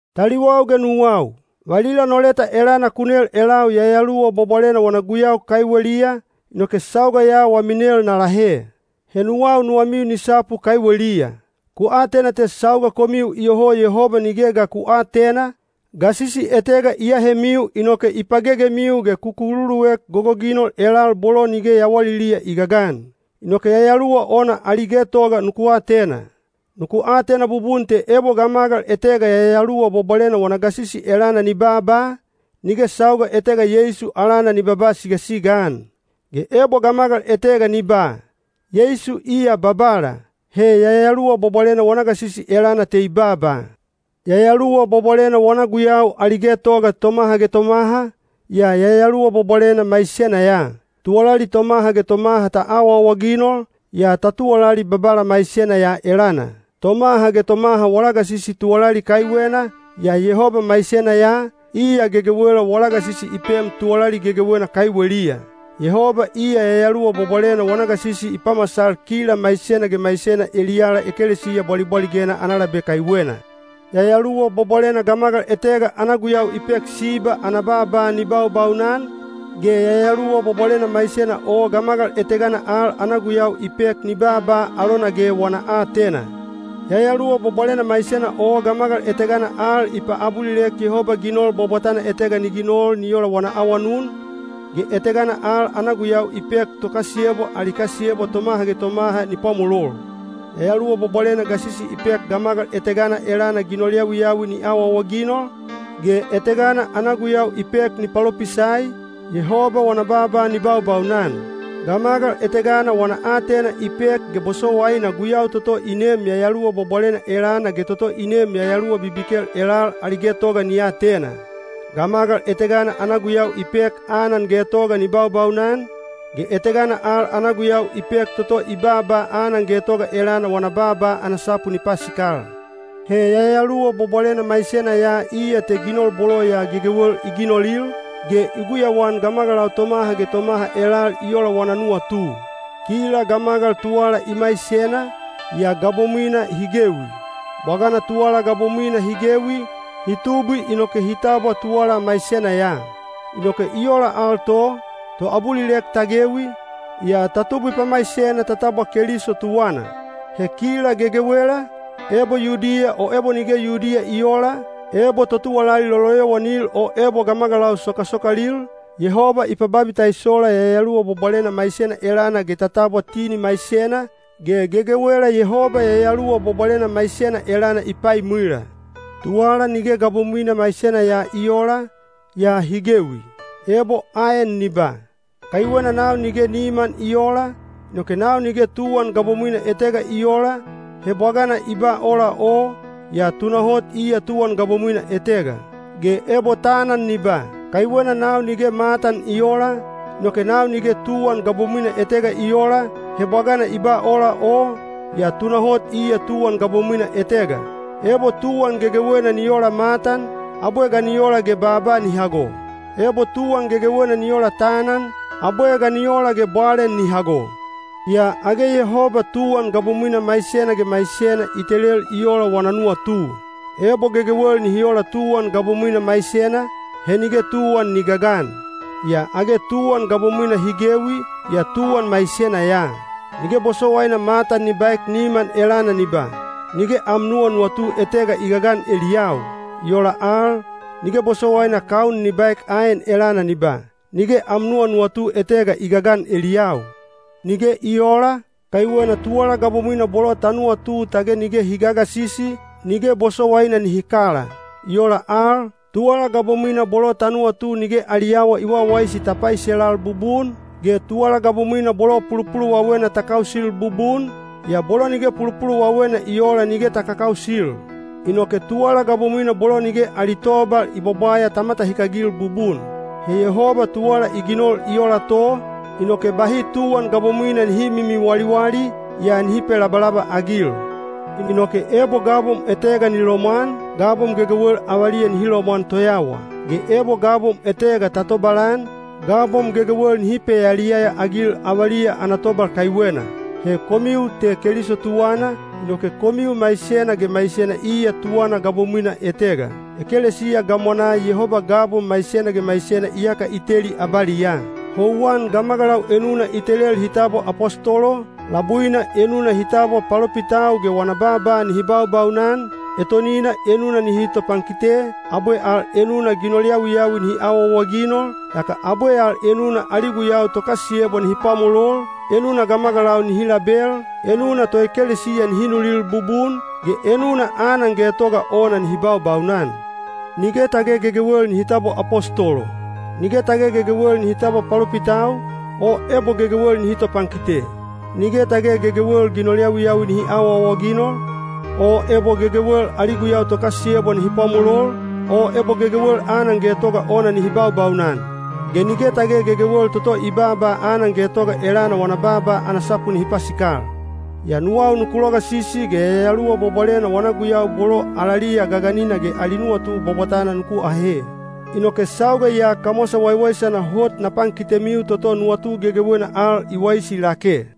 Taliwau ge nuwau, valila no leta elana ku nel elau Yayaluwa Bwabwalena wana guyau kaiweliya, inoke sauga ya wami nel na lahe. He nuwau nuwamiu ni sapu kaiweliya. Ku atena te sauga komiu iyoho Yehoba nige ga ku aatena, gasisi etega i ahemiu inoke i pagegemiu ge ku kululuek gogoginol elal bolo nige yawaliliya i gagan. Inoke yayaluwa ona ali getoga nuku atena. Nuku atena bubun te ebo gamagal etega Yayaluwa Bwabwalena wana gasisi elana ni baaba, nige sauga etega Yeisu alana ni babaa sigasiga-an. Ge ebo gamagal etega ni ba, “Yeisu iya Babala,” he Yayaluwa Bwabwalena wana gasisi elana te i baaba. Yayaluwa Bwabwalena wana guyau ali getoga tomaha ge tomaha, yaa Yayaluwa Bwabwalena maisena ya. Tuwalali tomaha ge tomaha ta awaawaginol, yaa ta tuwalali Babala maisena ya elana. Tomaha ge tomaha wala gasisi tuwalali kaiwena, yaa Yehoba maisena ya, iya gegewela wala gasisi i pem tuwalali gegewena kaiweliya. Yehoba iya Yayaluwa Bwabwalena wana gasisi i pamasal kila maisena ge maisena eliyala ekelesiya bwalibwaligena ana labe kaiwena. Yayaluwa Bwabwalena gamagal etega ana guyau i pek siba ana baaba ni baubaunan, ge Yayaluwa Bwabwalena maisena o gamagal etegana al ana guyau i pek ni baaba alona ge wana aatena. Yayaluwa Bwabwalena maisena o gamagal etegana al i paabulilek Yehoba ginol bwabwatana etega ni ginol ni ola wana awanun, ge etegana al ana guyau i pek tokasiyebwa ali kasiyebwa tomaha ge tomaha ni pwamolol. Yayaluwa Bwabwalena gasisi i pek gamagal etegana elana ginol yawiyawi ni awaawaginol, ge etegana ana guyau i pek ni palopisai, Yehoba wana baaba ni baubaunan. Gamagal etegana wana aatena i pek ge bosowaina guyau toto i neem Yayaluwa Bwabwalena elana ge toto i neem yayaluwa bibikel elal ali getoga ni atena. Gamagal etegana ana gu yau i pek anan getoga ni baubaunan, ge etegana al ana guyau i pek toto i baaba anan getoga elana wana baaba ana sapu ni pasikal. He Yayaluwa Bwabwalena maisena ya iya te ginol bolo ya gegewel i ginolil, ge i guyauan gamagalau tomaha ge tomaha elal i ola wana nuwatu. Kila gamagal tuwala i maisena, yaa gabomwina hi gewi. Bwagana tuwala gabomwina hi gewi, hi tubwi inoke hi tabwa tuwala maisena ya. Inoke i ola al to, toabulilek ta gewi, yaa ta tubwi pamaisena ta tabwa Keliso tuwana. He kila gegewela, ebo Yudiya o ebo nige Yudiya i oola, ebo totuwalali loloyowanil o ebo gamagalau sokasokalil, Yehoba i pababitaisola Yayaluwa Bwabwalena maisena elana ge ta tabwa tini maisena, ge gegewela Yehoba Yayaluwa Bwabwalena maisena elana i paimwila. Tuwala nige gabomwina maisena ya i oola, yaa hi gewi. Ebo aen ni ba, “Kaiwena nau nige niman i oola, inoke nau nige tuwan gabomwina etega i oola,” he bwagana i ba ola o, yaa tunahot iya tuwan gabomwina etega. Ge ebo tanan ni ba, “Kaiwena nau nige matan i oola, inoke nau nige tuwan gabomwina etega i oola,” he bwagana i ba ola o, yaa tunahot iya tuwan gabomwina etega. Ebo tuwan gegewena ni ola matan, abwe ga ni ola ge baaba ni hago? Ebo tuwan gegewena ni ola tanan, abwe ga ni ola ge bwalen ni hago? Yaa age Yehoba tuwan gabomwina maisena ge maisena i telel i ola wana nuwatu. Ebo gegewel nihi ola tuwan gabomwina maisena, he nige tuwan ni gagan. Yaa age tuwan gabomwina hi gewi, yaa tuwan maisena ya. Nige bosowaina matan ni baek niman elana ni ba, “Nige am nuwanuwatu etega i gagan eliyau.” I ola al, nige bosowaina kaun ni baek aen elana ni ba, “Nige am nuwanuwatu etega i gagan eliyau.” Nige i oola, kaiwena tuwala gabomwina bolo ta nuwatu tage nige hi gagasisi, nige bosowaina nihi kala. I ola al, tuwala gabomwina bolo ta nuwatu nige ali awa i wawaisi ta paiselal bubun, ge tuwala gabomwina bolo pulupuluwawena ta kausil bubun, yaa bolo nige pulupuluwawena i oola nige ta kakausil. Inoke tuwala gabomwina bolo nige ali tobal i bwabwaya ta matahikagil bubun. He Yehoba tuwala i ginol i ola to, inoke bahi tuwan gabomwina nihi mimiwaliwali, yaa nihi pelabalabaagil. Inoke ebo gabom etega ni lomwan, gabom gegewel avaliya nihi lomwan toyawa. Ge ebo gabom etega ta tobalan, gabom gegewel nihi peyaliyaya-agil avaliya ana tobal kaiwena. He komiu te Keliso tuwana, inoke komiu maisena ge maisena iya tuwana gabomwina etega. Ekelesiya gamwanaa Yehoba gabom maisena ge maisena iyaka i teli abaliyaa. Houwan gamagalau enuna i telel hi tabwa apostolo, labuina enuna hi tabwa palopitau ge wana baaba nihi baubaunan, etonina enuna nihi topankite, abwe al enuna ginol yawiyawi nihi awaawaginol, yaka abwe al enuna ali guyau tokasiyebwa nihi pwamolol, enuna gamagalau nihi label, enuna toekelesiya nihi nulil bubun, ge enuna anan getoga ona nihi baubaunan. Nige tage gegewel nihi tabwa apostolo. Nige tage gegewel nihi tabwa palopitau, o ebo gegewel nihi topankite. Nige tage gegewel ginol yawiyawi nihi awaawaginol, o ebo gegewel ali guyau tokasiyebwa nihi pwamolol, o ebo gegewel anan getoga ona nihi baubaunan. Ge nige tage gegewel toto i baaba anan getoga elana wana baaba ana sapu nihi pasikal. Yaa nuwau nuku logasisi ge Yayaluwa Bwabwalena wana guyau bolo alaliya gaganina ge ali nuwatu bwabwatana nuku ahe. Inoke sauga ya kamwasa waiwaisana hot na pankitemiu toto nuwatu gegewena al i waisi lake.